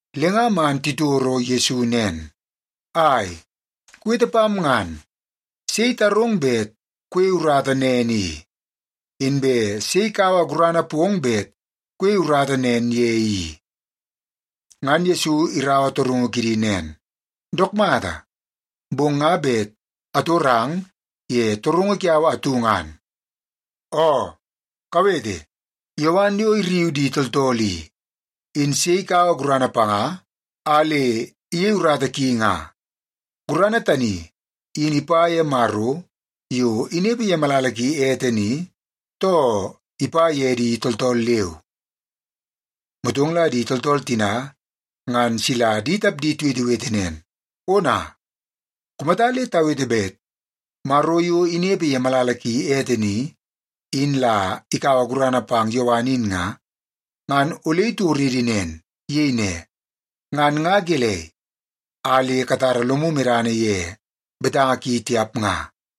Le nga man titoro Yesu nen, “Ai, kuwete pam ngan! Sei itarong bet kuyei urata nen i? Inbe sei ikaua gurana pong bet kuyei urata nen ye i?” Ngan Yesu iraua torungu kidi nen, “Dook mata, bong nga bet atorang ye torungu kiau atu ngan. Oo, kawete! Yowan yo irriu di tooltool i, in sei ikaua gurana panga a le iyei urata ki nga? Gurana tani in ipa ye Maro yo inepe ye malala ki ete ni, too ipa ye di tooltool leu?” Motong la di tooltool tina ngan sila di tapdi tiwetewete nen, “Ona! Kumata le tawete bet Maro yo inepe ye malala ki ete ni, in la ikaua gurana pang Yowan in nga, ngan ole itoridi nen. Iyei ne, ‘Ngan nga gelei a le katara lomu medana ye betanga ki tiap nga?’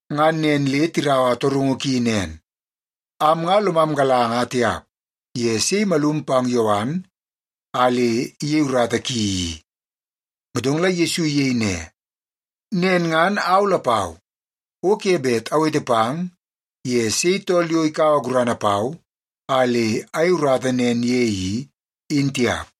Ngan nen le tiraua torungu ki nen, “Am nga lomam galanga tiap ye sei imalum pang Yowan a le iyei urata ki i.” Motong la Yesu iyei ne, “Nen ngan au lapau, o ke bet awete pang ye sei tool yo ikaua gurana pau a le ayei urata nen ye i, in tiap.”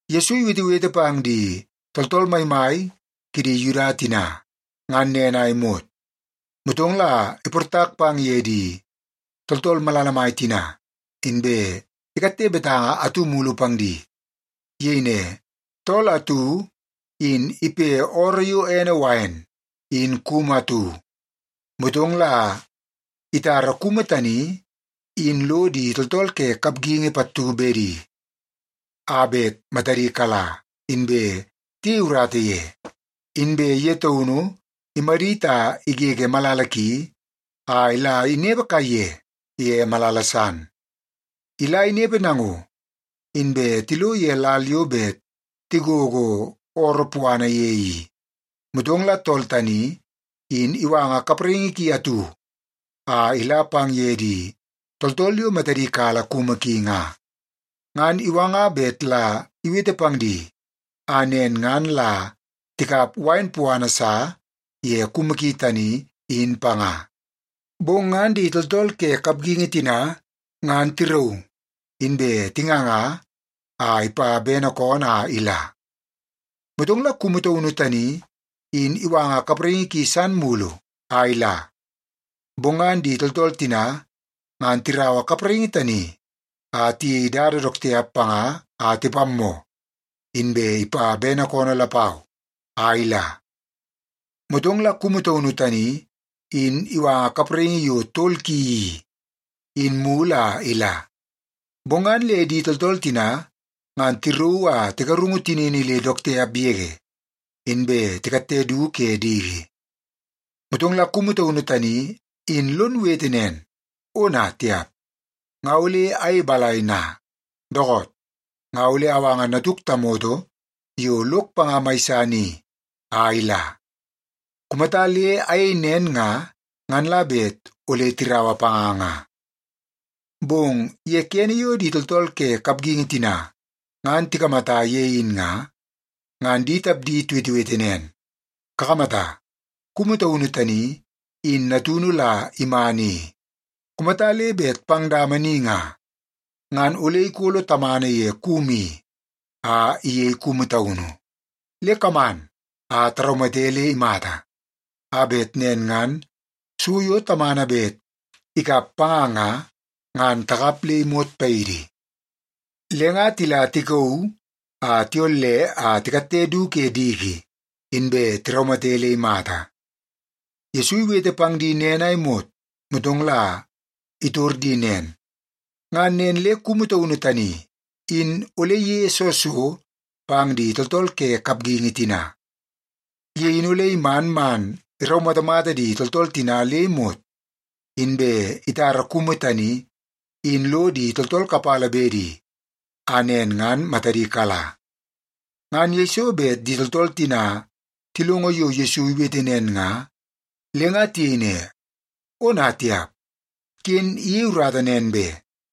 Yesu iwetewete pang di tooltool maimai kidi Yuda tina, ngan nen a imot. Motong la iportak pang ye di tooltool malala mai tina, inbe ikatte betanga atu mulu pang di. Iyei ne, “Tool atu in ipe ooroo yo ene wain in kumu atu. Motong la itara kumu tani in lo di tooltool ke kapgingi pattu bedi a bet matadi kala, inbe tiyei urata ye. Inbe ye taunu imadit a igege malala ki a la inepe kaiye ye malala san. Ila inepe nango, inbe tilo ye lal yo bet tigogo ooroo puana ye i, motong la tool tani in iwanga kapraingi ki atu a ila pang ye di tooltool yo matadi kala kumu ki nga. Ngan iwanga bet la iwete pang di, a nen ngan la tikap wain puana sa ye kumu ki tani, in panga. Bong ngan di tooltool ke kapgingi tina ngan tirauu, inbe tinganga a ipa bene koonoo a ila. Motong la kumu taunu tani in iwanga kapraingi ki san mulu a ila. Bong ngan di tooltool tina ngan tiraua kapraingi tani a tiyei dada dook tiap panga a tipammoo, inbe ipa bene koonoo lapau a ila. Motong la kumu taunu tani in iwanga kapraingi yo tol ki i, in mulu a ila. Bong ngan le di tooltool tina ngan tirauu a tigarungu tinini le dook tiap yege, inbe tikatte du ke diki. “Motong la kumu taunu tani in lon wete nen, ‘Ona tiap! Nga ole ayei balai na? Dookoot, nga ole awanga natuk tamoto yo lok panga mai san i a ila. Kumata le ayei nen nga, ngan la bet ole tiraua panga nga.’ “Bong ye kene yo di tooltool ke kapgingi tina ngan tikamata ye in nga, ngan di tapdi tiwetewete nen, ‘Kakamata, kumu taunu tani in natunu la iman i. Kumata le bet pang dama ni nga, ngan ole ikolo tamana ye kumu i a iyei kumu taunu. Le kaman a taraumate le imata, a bet nen ngan so yo tamana bet ikap panga nga, ngan takap le imot paidi.’ Le nga tila tikauu a tiyolle a tikatte du ke diki, inbe tiraumate le imata.” Yesu iwete pang di nen a imot, motong la itor di nen, “Ngan nen le kumu taunu tani in ole iyeie soo so pang di tooltool ke kapgingi tina? Ye in ole iman man iraumatamata di tooltool tina le imot, inbe itara kumu tani in lo di tooltool kapala bedi a nen ngan matadi kala.” Ngan yeiso bet di tooltool tina tilongo yo Yesu iwete nen nga, le nga tiyei ne, “Ona tiap! Ken iyei urata nen be!”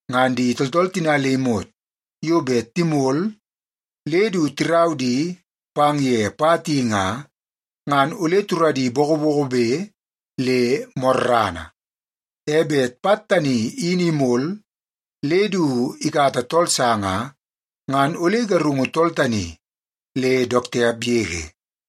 Ngan di tooltool tina le imot yo bet timol le du tirau di pang ye pat i nga, ngan ole turadi bokobokobe le morrana. E bet pat tani in imol le du ikata tool sa nga, ngan ole igarungu tool tani le dook tiap yege.”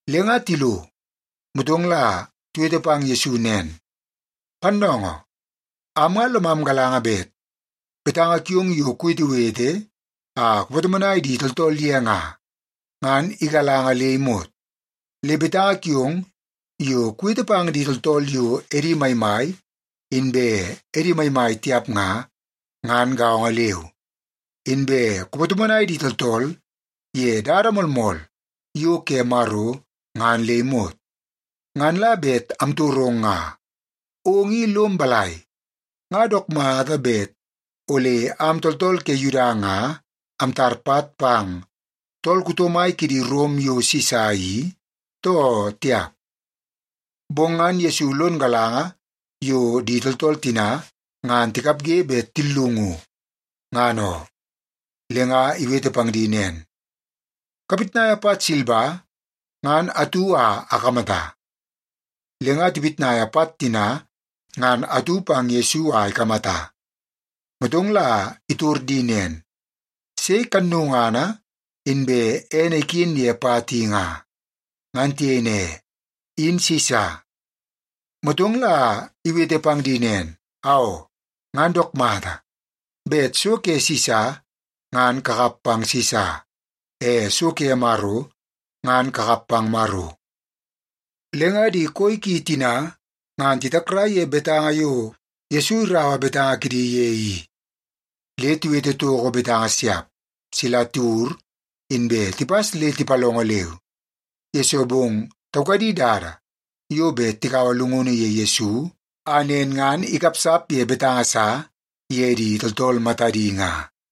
Le nga tilo, motong la tiwete pang Yesu nen, “Pannoongoo! Am nga lomam galanga bet betanga kiong yo kuwetewete a kupatomonai di tooltool ye nga, ngan igalanga le imot. Le betanga kiong yo kuwete pang di tooltool yo edi maimai, inbe edi maimai tiap nga, ngan gaongo leu. Inbe kupatomonai di tooltool ye dada moolmool yo ke Maro ngan le imot. Ngan la bet amtorong nga, ong i lom balai? Nga dook mata bet ole am tooltool ke Yuda nga amtar pat pang tool kuto mai kidi Rom yo Sisa i, too tiap?” Bong ngan Yesu lono galanga yo di tooltool tina ngan tikapge bet tillungu, ngan oo. Le nga iwete pang di nen, “Kapitnaia pat silba ngan atu a akamata.” Le nga tipitnaia pat tina ngan atu pang Yesu a ikamata, motong la itor di nen, “Sei kannungana inbe ene iken ye pat i nga?” Ngan tiyei ne, “In Sisa.” Motong la iwete pang di nen, “Aoo, ngan dook mata! Bet so ke Sisa, ngan kakap pang Sisa. E so ke Maro, ngan kakap pang Maro.” Le nga di koi ki tina ngan titakrai ye betanga yo Yesu iraua betanga kidi ye i. Le tiwete toko betanga siap, sila tiwur inbe tipas le tipalongo leu. Yesoo bong taukadi dada yo bet tikaua llungunu ye Yesu, a nen ngan ikapsap ye betanga sa ye di tooltool matadi nga.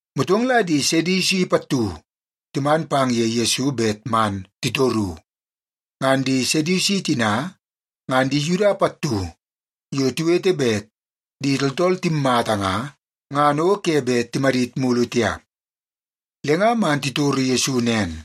Motong la di Sedusi pattu timan pang ye Yesu bet man titoru. Ngan di Sedusi tina, ngan di Yuda pattu yo tiwete bet di tooltool timmata nga, ngan o ke bet timadit mulu tiap. Le nga man titoro Yesu nen,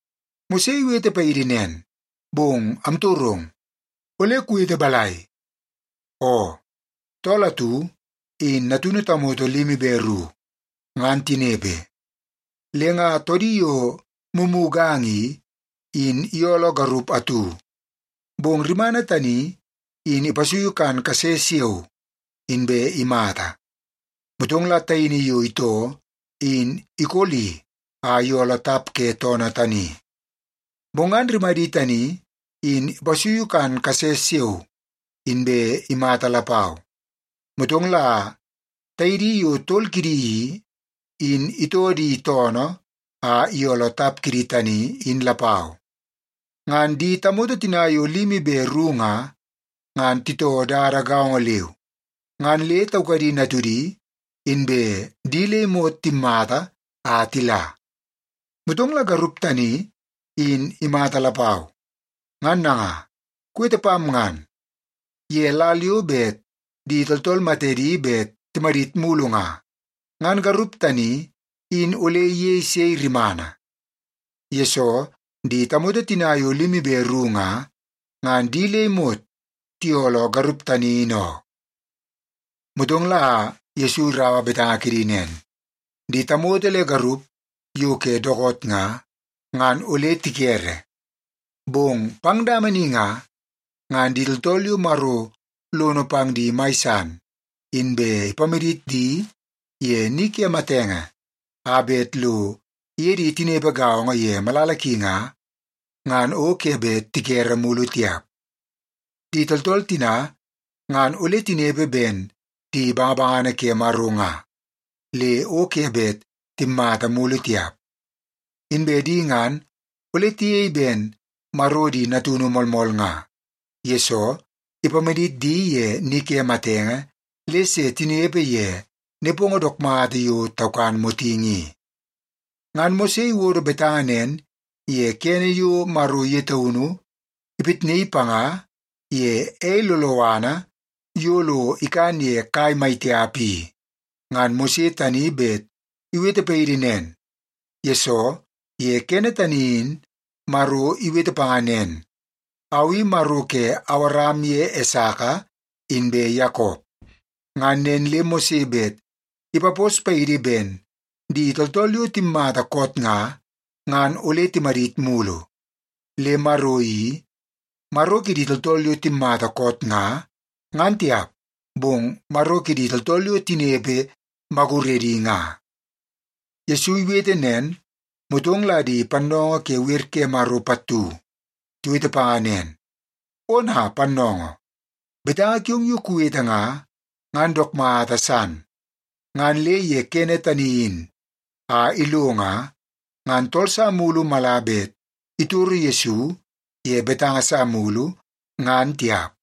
Mose iwete paidi nen, bong amtorong, ole kuwete balai? Oo, tool atu in natunu tamoto limi be ru. Ngan tinepe, le nga toodi yo mumuganga i, in iyooloo garup atu, bong rimana tani in ipasuiu kan kase siao, inbe imata. Motong la taini yo itoo in ikoli a iyooloo tap ke toodi tani. Bong ngan rimadi tani in ipasuiu kan kase siao, inbe imata lapau. Motong la taidi yo tol kidi i, in itoo di toonoo a iyooloo tap kidi tani in lapau. Ngan di tamoto tina yo limi be ru nga, ngan titoo dada gaongo leu, ngan le taukadi natudi, inbe di le imot timmata a tila. Motong la garup tani, in imata lapau. Ngan nanga, kuwete pam ngan, ye lal yo bet di tooltool matedi bet timadit mulu nga, ngan garup tani in ole iyei sei rimana? Yesoo, di tamoto tina yo limi be ru nga, ngan di le imot tiyooloo garup tani in oo.” Motong la Yesu iraua betanga kidi nen, “Di tamoto le garup yo ke dookoot nga, ngan ole tikere. Bong pang dama ni nga, ngan di tooltool yo Maro lono pang di mai san inbe ipamadit di ye ni ke matenge a bet lo iye di tinepe gaongo ye malala ki nga, ngan o ke bet tikere mulu tiap. Di tooltool tina ngan ole tinepe ben di bangabangana ke Maro nga, le o ke bet timmata mulu tiap. Inbe di ngan ole tiyei ben Maro di natunu moolmool nga, yesoo ipamadit di ye ni ke matenge le se tinepe ye nepongo dook mata yo taukan motingi i. Ngan Mose iwodo betanga nen ye kene yo Maro ye taunu ipitnaii panga ye ei loloana yo lo ikan ye kai mai tiap i. Ngan Mose tani bet iwete paidi nen, yesoo ye kene tani in Maro iwete panga nen, ‘Au i Maro ke Awaram ye Esaka inbe Yakop.’ Ngan nen le Mose bet ipapos paidi ben di tooltool yo timmata koot nga, ngan ole timadit mulu. Le Maro i, Maro kidi tooltool yo timmata koot nga, ngan tiap, bong Maro kidi tooltool yo tinepe maguredi nga.” Yesu iwete nen, motong la di pannoongoo ke wer ke Maro pattu tiwete panga nen, “Ona, pannoongoo! Betanga kiong yo kuwete nga, ngan dook mata san.” Ngan le ye kene tani in a ilo nga, ngan tool sa mulu mala bet itoro Yesu ye betanga sa mulu, ngan tiap.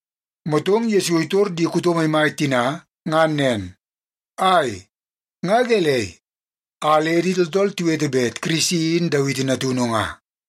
Motong Yesu itor di kuto maimai tina ngan nen, “Ai, nga gelei a le di tooltool tiwete bet Kirisi in Dawiti natunu nga?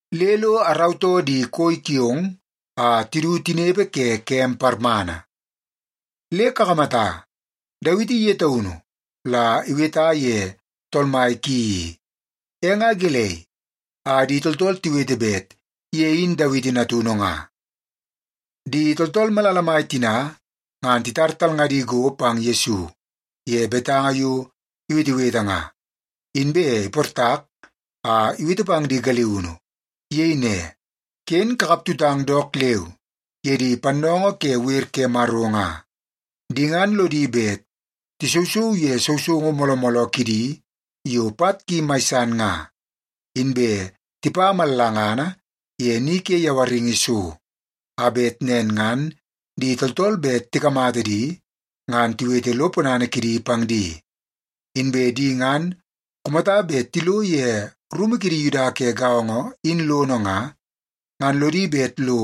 le lo arautoo di koi kiong a tidu tinepe ke kem parmana.” ’ Le kakamata, Dawiti ye taunu la iweta ye Tool Mai ki i. E nga gelei a di tooltool tiwete bet ye in Dawiti natunu nga?” Di tooltool malala mai tina ngan titar talngadi go pang Yesu ye betanga yo iwetewete nga, inbe iportak a iwete pang di galiunu. Iyei ne, “Ken kakaptutang dook leu ye di pannoongoo ke wer ke Maro nga. Di ngan lodi bet tisousou ye sousoungu mooloo mooloo kidi yo pat ki mai san nga, inbe tipa mallangana ye ni ke yawaringi so, a bet nen ngan di tooltool bet tikamata di ngan tiwete lo ponana kidi pang di. Inbe di ngan kumata bet tilo ye rumu kidi Yuda ke gaongo in lono nga, ngan lodi bet lo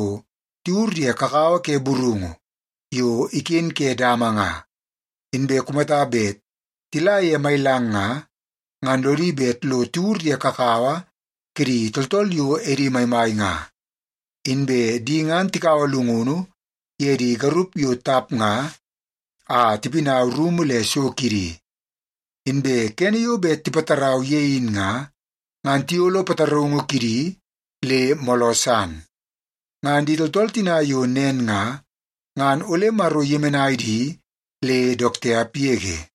tiwur ye kakawa ke burungu yo iken ke dama nga, inbe kumata bet tila ye mailang nga, ngan lodi bet lo tiwur ye kakawa kidi tooltool yo edi maimai nga. Inbe di ngan tikaua llungunu ye di garup yo tap nga a tipinau rumu le so kidi. Inbe kene yo bet tipatarau ye in nga, ngan tiyolo pataraungu kidi le mooloo san. Ngan di tooltool tina yo nen nga, ngan ole Maro iyemenai di le dook tiap yege.”